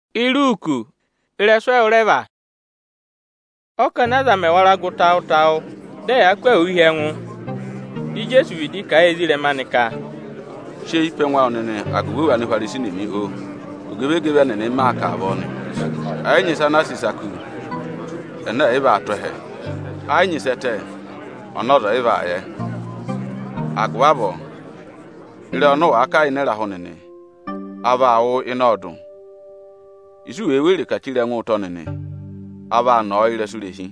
Ẹnị a vọrọ ka èe hí angwa anị? Ọ́kọnị aza mẹ̀ wara gụ tawụ-tawụ, dị ẹ yaa kụ́ ahụụ hi ẹngụ, dị Ijeesu vịdị kà a yị ezirẹma anị ka, “Sị eyi pe ẹngụ awụ nịnị agụvị òwù Anihwarisi nịnị, oo! Ogevegeve ẹnịnị m maa kà avọọ nị. Ẹ yị nyị ịsa ana a sị ịsa kú, ẹnẹ ẹ̀ yị vaa tụ́ ẹhẹ; ẹ yị nyị ịsị ẹ tẹ, ọnị ọza ọ̀ yị vaa yẹ. Agụvị avọọ ịrẹyị ọnị ụ wàa kà ịnị ịrahụ nịnị, a vaa wụ́ ọ ịnị ọọdụ; ịsị u wèe were kà chire ẹngụ ụtọ nịnị, a vaa nọ ọ ị́rẹsụ irehi.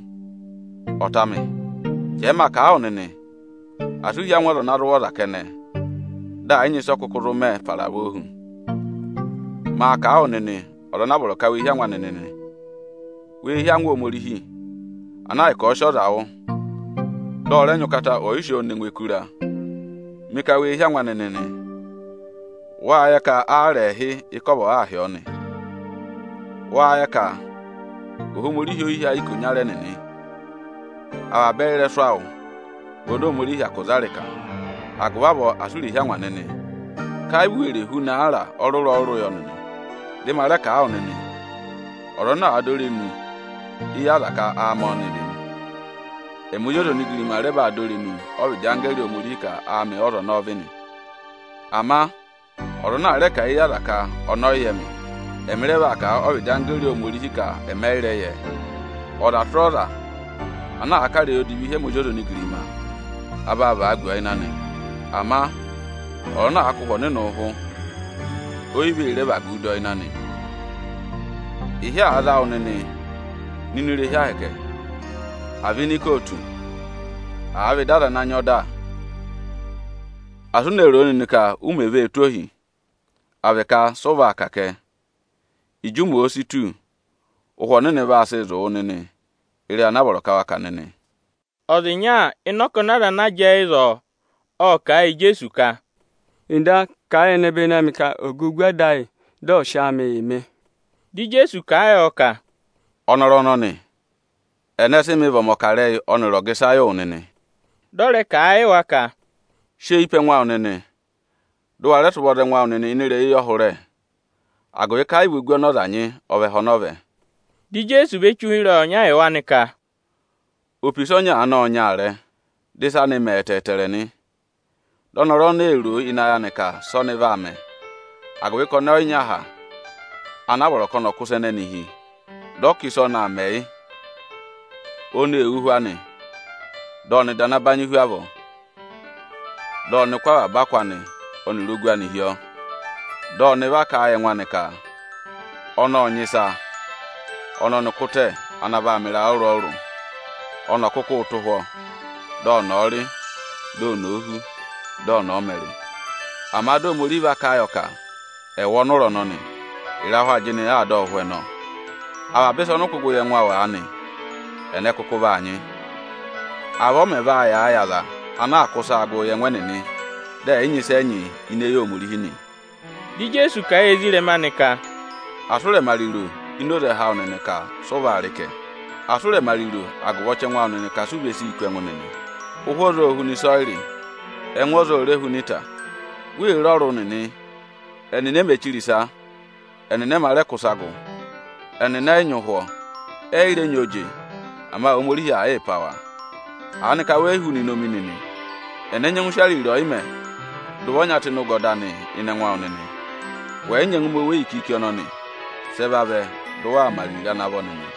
“Ọta amị, jẹẹ ma kà a wụ nịnị, asị u hí angwa ọza ana zụ wụ̀ ọza kẹnẹ, dị ẹ̀ yị nyị ịsị ọ kụkụ zụ mẹ para avọọ hu. Maa kà a wụ nịnị ọza ana a vọrọ ka wee hí angwa anị nịnị: Wee hí angwa Ohomorihi, ana ahịka ọ̀ọ sị ọza wụ̀, dị ọ rẹ nyị ụkata ọyị sị ọọ ne ngụ ẹkụra. Mị ka wee hí angwa anị nịnị! Wáá yẹ ka aara ẹẹhị ịkọvọ aa hị́ ọọ nị? Wáá yẹ ka Ohomorihi o yi hí ayị ikonyara ẹnịnị? Avaba ẹyị ịrẹsụ awụ nịnị vị oni Ohomorihi hyakụ za ịrịka. Agụvị avọọ asị u rè hí angwa nịnị, ka ẹ yị vị u were huna aara ọrụrụ-ọrụrụ yọ nịnị! “Dị ma rẹ kà a wụ nịnị ka, Ọza ana àa dọ irenu éyi aza ka áamị ọ́nị vị nị, emi Ozi ọza onigirima rẹ vaa dọ irenu ọ́vịdị anggẹẹrị Ohomorihi ka áamị ọ́za ọnọọ vị nị. Ama ọza ana àa rẹ kà a ẹ́yị aza ka ọnị ọ yị yẹ mị, ẹmị rẹ vaa kà a ọ́vịdị anggẹẹrị Ohomorihi ka ẹmị ẹ yị rẹ yẹ ẹ. Ọza tụra ọza ana àa kà ịrẹyị odivi hi ẹmị Ozi ọza onigirima, a vaa vagu ọ ịnị anị. Ama ọza ana àa kụ̀ Ụhwẹ Ọnịnị ụhụ, o yi vee re ẹvagu dọ ịnị anị. Ịhị àa za wụ nịnị nọ ini irehi Ohomorihi, àa vị ini ikootu, àa vị ịdị aza ana nyị ọda, asị u ne ro o nịnị ka u mè vee tụ́ ohi, à vị ka sị ụ vaa kà kẹ! Ịjị ụmẹ òo si tù, Ụhwẹ Ọnịnị vaa sịị zụ̀ wụ nịnị ịrẹyị ana a vọrọ ka wa kà nịnị.” Ọza ịnya ịnị ọkọnị aza ana jẹẹ ịzọọ, ộ kà a yị Ijeesu ka, “Nda, kà a yị ẹnẹbẹnị amị ka ọ̀ gà ogu ada ayị, dị ọ̀ sị áamị yị mị!” Dị Ijeesu kà a yọ ka, “Ọnọrụ ọnọnị, ẹnẹ sị mị vị ọmọkarẹyị ọnịrị ojirẹyị yị wụ nịnị?” Dị ọ rẹ kà a yị wa ka, “Sị eyi pe ẹngụ awụ nịnị, dị ụ wa rẹ sị ụvọ za ẹngụ awụ nịnị ịnị ịrẹyị eyọhụrẹ o, agụvị ka ẹ yị vị ogu ọnị ọza nyị ọ vị ẹhẹ ọnọọ vẹ.” Di Ijeesu ve che ụhịrẹyị ọnya yị wa nị ka, “Opisa ọnya aanị ộ nyị aarẹ, dị ịsa ịnị anị mẹ ẹtẹẹtẹrẹ nị. Dị ọnọrụ ọnọọ ee ro o ịnị ayị anị ka sị ọnị vaa mẹ, agụvị ka ọnị ọ yị nyị aha ana a vọrọ ka ọnị ọ̀ kụ́ ịsa ẹnẹnị hi. Dị ọ ka ịsị ọnị aa mẹ, yị: oni ee wú ụhwọ anị, dị ọnị ọ̀ dà ana banyị hu avọọ. Dị ọnị kụ́ avaba akụ anị ọnịrị ogu anị hi ọọ. Dị ọnị va kà a yị ẹngụ anị ka ọnị ộ nyị ịsa ọnị ọnị kụ́ tẹ ana vaa mẹ ịrayị ọrụrụ-ọrụrụ; ọnị ọ̀ kụkụụ tụ́ ụhwọ́, dị ọnị ọ̀ọ rị, di oni òo hú, dị ọnị ọ̀ọ mẹrị! Ama di Ohomorihi va kà a yọ ka: ‘Ẹwụ ọnụra ọnọnị, ịrahụ ajịnị aa dọ wụ ụhwẹ nọ! Avaba ịsa ọnị ụ kụ́ gụ yị ẹngụ aanị, ẹnẹ kụkụ vaa nyị?’ Avọọ ọ mẹ̀ vaa yàa yị aza anaa kụ́ ịsaa gụ yị ẹngụ ẹnịnị kẹnẹ, dị ẹ̀ yị nyị ịsị ẹ nyị ini eyi Ohomorihi nị.” Dị Ijeesu kà a yị ezirẹma anị ka, “Asị ụ rẹ̀ mẹ ariro ini oze ẹhẹ awụ nịnị ka sị ụ vaa rị kẹ! Asị ụ rẹ mẹ ariro agụvị ọchẹngụ awụ nịnị ka si u ve sii kú ẹngụ nịnị! Ụhwẹ ọza ô huna ịsọyịrị, ẹngụ ọza o re huna ịta. Wee re ọrụ nịnị, ẹnịnị e mē chire ịsa, ẹnịnị ẹ mā rẹ kụ́ ịsa gụ. Ẹnịnị ẹ yị nyị ụhwọ, ẹ yị rẹ nyị oje; ama Ohomorihi aa yịị pá wa. Aanịka we yi huna inomi nịnị? Ẹnẹ nyẹngụ sị ariro ọyịmẹ̀ dà ụvọ ọnya tụ́ ịnị ụgọdọ anị ịnị ẹngụ awụ nịnị? Wẹ̀ yị nyẹngụ mẹ oweyi kiiki ọnọnị nịnị, sị ẹ vavẹ dị ụ waa mẹ ariro ịsa ana vọ nịnị?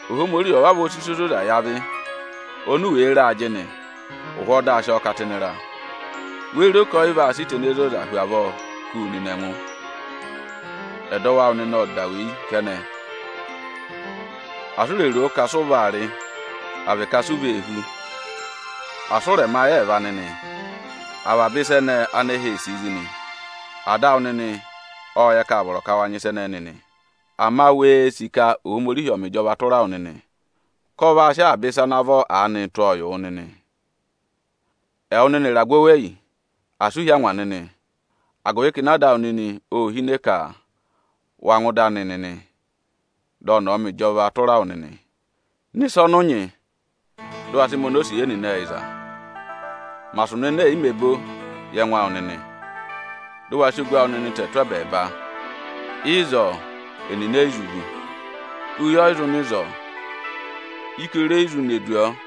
Ohomorihi ộ vavọọ sị ịsa ozoza yị avị, oni u wèe re ajịnị, ụhwọọ di a sị ọọ ká tụ́ ịnị ịra, wéé ro ka ọ yị vaa sị ịta ene zoza hu avọọ kú wu nịnị ẹngụ? Ẹdọwụ awụ nịnị ộ da weyi kẹnẹ. Asị u rè ro o ka sị ụ vaa rị, à vị ka si u vee hú, asị ụ rẹ̀ rẹ mẹ ayị ẹẹva nịnị! Avaba ịsa ẹnẹẹ ánẹhẹ ee sìi zị nị. Ada awụ nịnị ộ yẹ ka â vọrọ ka wa nyị ịsa ẹnẹnị nịnị. Ama wee sì ka Ohomorihi ọ̀ọ mẹ ịjọvaa tụra wụ nịnị, ka ọ vaa sị avaba ịsa ana vọ aanịị tụ́ ọọ yị wụ nịnị.” “Ẹwụ nịnị ịragụ oweyi, asị u hí angwa nịnị, agụvị ka ịnẹ Ada awụ nịnị ô hine ka wa ngụ ịdị anị nịnị dị ọnị ọ̀ọ mẹ ịjọvaa tụra wụ nịnị. Ná ịsa ọnị ụ nyị, dị ụ wa sị mẹ onosiye nịnị ẹyịza! Mẹ asụnụ ene è yi mē bo yị ẹngụ awụ nịnị, dị ụ wa sị ogu awụ nịnị tẹ tụ́ ẹbẹẹba! Ịzọọ, ẹnịnị e yi zụ vú, oyi ọ yị zụ nọ ịzọọ, ikere o yi re zụ ne du ọọ.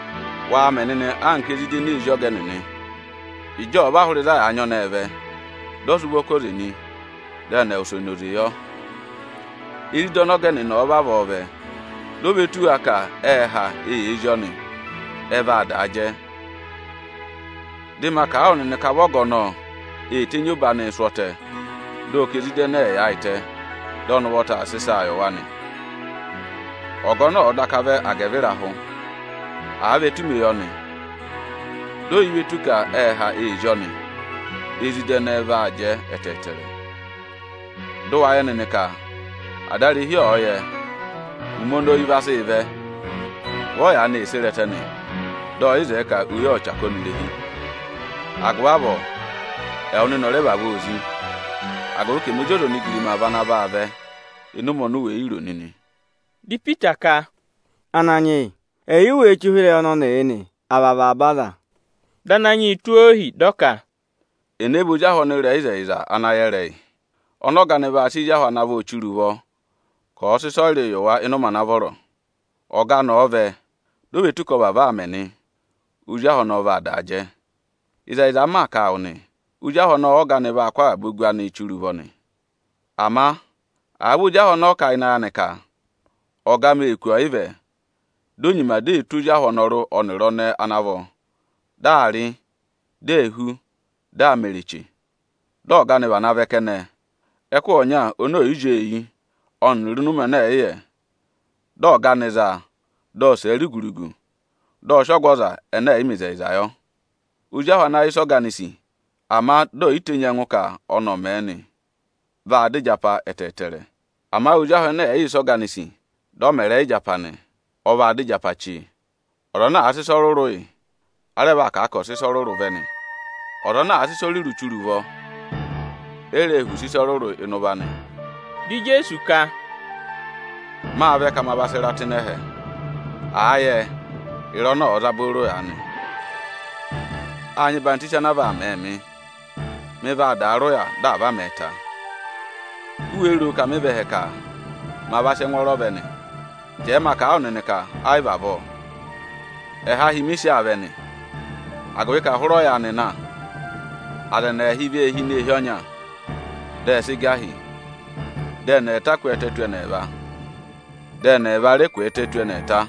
Wa mẹ̀ ebira nịnị anka ezida ene ee zí ọga ẹnịnị! Ịjị ọ̀ọ va hụrẹ ịzị a yà aa nyị ọnẹẹ vẹ, dị ọ sị ụvọ ká oze nị, dị ẹ wụsẹ na oze yọ. Ezida ọnị ọga ẹnịnị ọ̀ọ vavọọ vẹ, di o ve tù wa ka ệ ha, eyee zí ọnị nị, ẹ vaa daa jẹ. Dị ma kà a wụ nịnị, ka vị ọga ọnọọ ee tenyi obo anịị sụ́ ọtẹ, dị ọ ka ezida ẹnẹẹ ẹ̀ yaayịtẹ, dị ọnị ụvọta aa sị ịsaa yị wa nị. Ọga ọnọọ ọ̀ọ daka vẹ agẹvịrahụ, àa vị etumeyọnị, di o yi ve tù ka ệ ha ee zí ọnị nị, ezida ẹnẹẹ vaa jẹ ẹtẹẹtẹrẹ. Dị ụ wa yẹ nịnị ka adarehi ọ̀ọ yẹ ụmẹ oni oyi vaa sị vẹ, vị ọ yaanị ee sere ẹtẹ nị, dị ọ yị zẹẹ ka oyi ọ̀ chaka ọnị irehi. Agụvị avọọ, ẹwụ nịnị ọ̀ rẹ vavọọ zí, agụvị ka ẹmị Ozi ọza onigirima vị ana vaa vẹ ịnị ụmẹ oni u we yi ro nịnị!” Dị Ipita ka, “Ananyị yị, ẹyị ú wéé che ụhịrẹyị ọnọnịị yị nị, à vị avaba aza?” Dị Ananyị yị, tụ́ ohi, dị ọ ka, “Ẹnẹ vị ozi ahụ ọnịrẹyịzẹyịza ana yẹ ịrẹyị, ọnị ọga anị vaa sị ezi ahụ ana vọ chire ụvọ ka ọ̀ọ sị ịsọyịrịị yị wa ịnị ụmẹ ana vọrọ? Ọga anị ọ̀ọ vẹ, di o ve tù ka ọ vavọọ aa mẹ nị, ozi ahụ ọnọọ vaa daa jẹ. Ịzẹyịza m maa kà a wụ nị, ozi ahụ ọnọọ ọ́ga anị vaa kụ́ avaba ogu anịị chire ụvọ nị. Ama àa vị ozi ahụ ọnọọ kà a ịnị ayị anị ka: ‘Ọga amị ee kù ọyịvẹ’, di o nyima di ee tụ́ ozi ahụ anọrụ ẹnịrị anẹẹ ana vọ, dị aa rị, di ee hú, dị aa mẹrị eche nị, dị ọga anị vana vẹ kẹnẹ ẹkụhị ọnya oni ò yi zí ọọ eyi ọnịrị ịnị ụmẹ ọnị ọ̀ yị yẹ. Dị ọga anị za a, dị ọ sẹ̀ ẹ rugu-rugu, dị ọ sị ọgụ ọza ẹnẹ ẹ̀ yị mẹ ịzẹyịza yọ. “Ozi ahụ ana àa yẹ ịsị ọga anị sì, ama di ò yi tenyi ẹngụ ka ọnị ọ̀ mẹ̀ ẹ nị, vaa dọ ịjapa ẹtẹẹtẹrẹ. Ama ozi ahụ ẹnẹ ẹ̀ yị yẹ ịsị ọga anị sì, dị ọ mẹ ịrẹyị ịjapa nị, ọ vaa dọ ịjapa chee. Ọza ana àa sị ịsa ọrụrụ yị, a rẹ vaa kà a ka ọ̀ sị ịsa ọrụrụ vẹ nị. Ọza ọnị ọza ọ̀ọ sị ịsa ọrụrụ chire ụvọ, o reē họ̀ use ịsa ọrụrụ ịnị ụvọ anị.” Dị Ijeesu ka, “Mâ vẹ ka ma va jị ịra tụ́ ịnị ẹhẹ. Àa yẹ, ịra ọnọọ ọ̀ọ za booro aanị! Â nyị ọyịhwọzenyi ana a vaa mẹẹ mị, mị vaa daa rị ụya dị à va mẹ̀ ẹ ta. U wéé ro ka mị vẹ ẹhẹ ka ma va sị ẹngwọọrọ vẹ nị? Jẹẹ maa kà a wụ nịnị ka ẹ yị vị avọọ. Ẹhahi mị sị aa vẹ nị. Agụvị ka hụrẹ ọyaanị na, aza ẹnị ẹẹhị vee hi ini eehi ọnya, dị ẹ sị gà hi. Dị ẹnị ẹẹta kwẹẹtẹ tù ẹnị ẹẹva, dị ẹnị ẹẹva ẹnị rẹ kwẹẹtẹ tù ẹnị ẹẹta.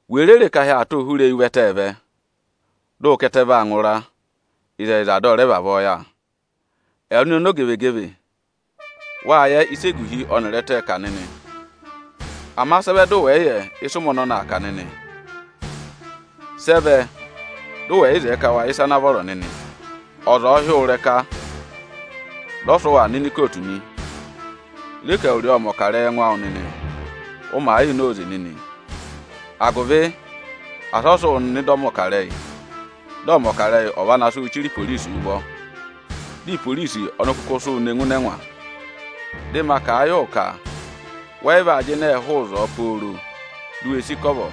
Wèe re re ka ahị aa tụ́ hụrẹ eyi ụvẹtẹẹ vẹ, dị ụ ka ẹtẹ vaa ngụra nịnị; ịzẹyịza, dị ọ vavọọ yà. Ẹwụ nịnị ọmọzakụyẹ, wâ yẹ ịsị eguhi ọnịrị ẹtẹẹ̄ kà nịnị; ama sị ẹ vẹ dị ụ wẹ̀ yị yẹ ịsị ụmẹ ọnọnị aa kà nịnị? “Sị ẹ vẹ dị ụ wẹ̀ yị zẹẹ ka wa yẹ ịsa ana vọrọ nịnị? Ọza ọ̀ọ hị́ wụ ịrẹka, dị ọ sị wụ aa nọ ini ikootu nị, re ka ẹwụrị ọọ ộ mẹ̀ ọkarẹyị ẹngụ awụ nịnị, ụ màa yịị na óze nịnị, agụvị asị ọ sị wụ nọ ịdị ọmọkarẹyị, dị ọmọkarẹyị ọ̀ va na sị wụ́ chire iporisi ụvọ, di iporisi ọnị kụkụ sị wụ ne ngụ ịnị ẹngwa. Dị ma kà a yị wụ ka wẹ yị vaa jịnẹẹ hụụ ịzọọ pooro di u we sì ịkọvọ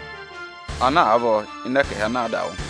ana àa vọ ịnị ẹkẹhị ana àa dà wụ.”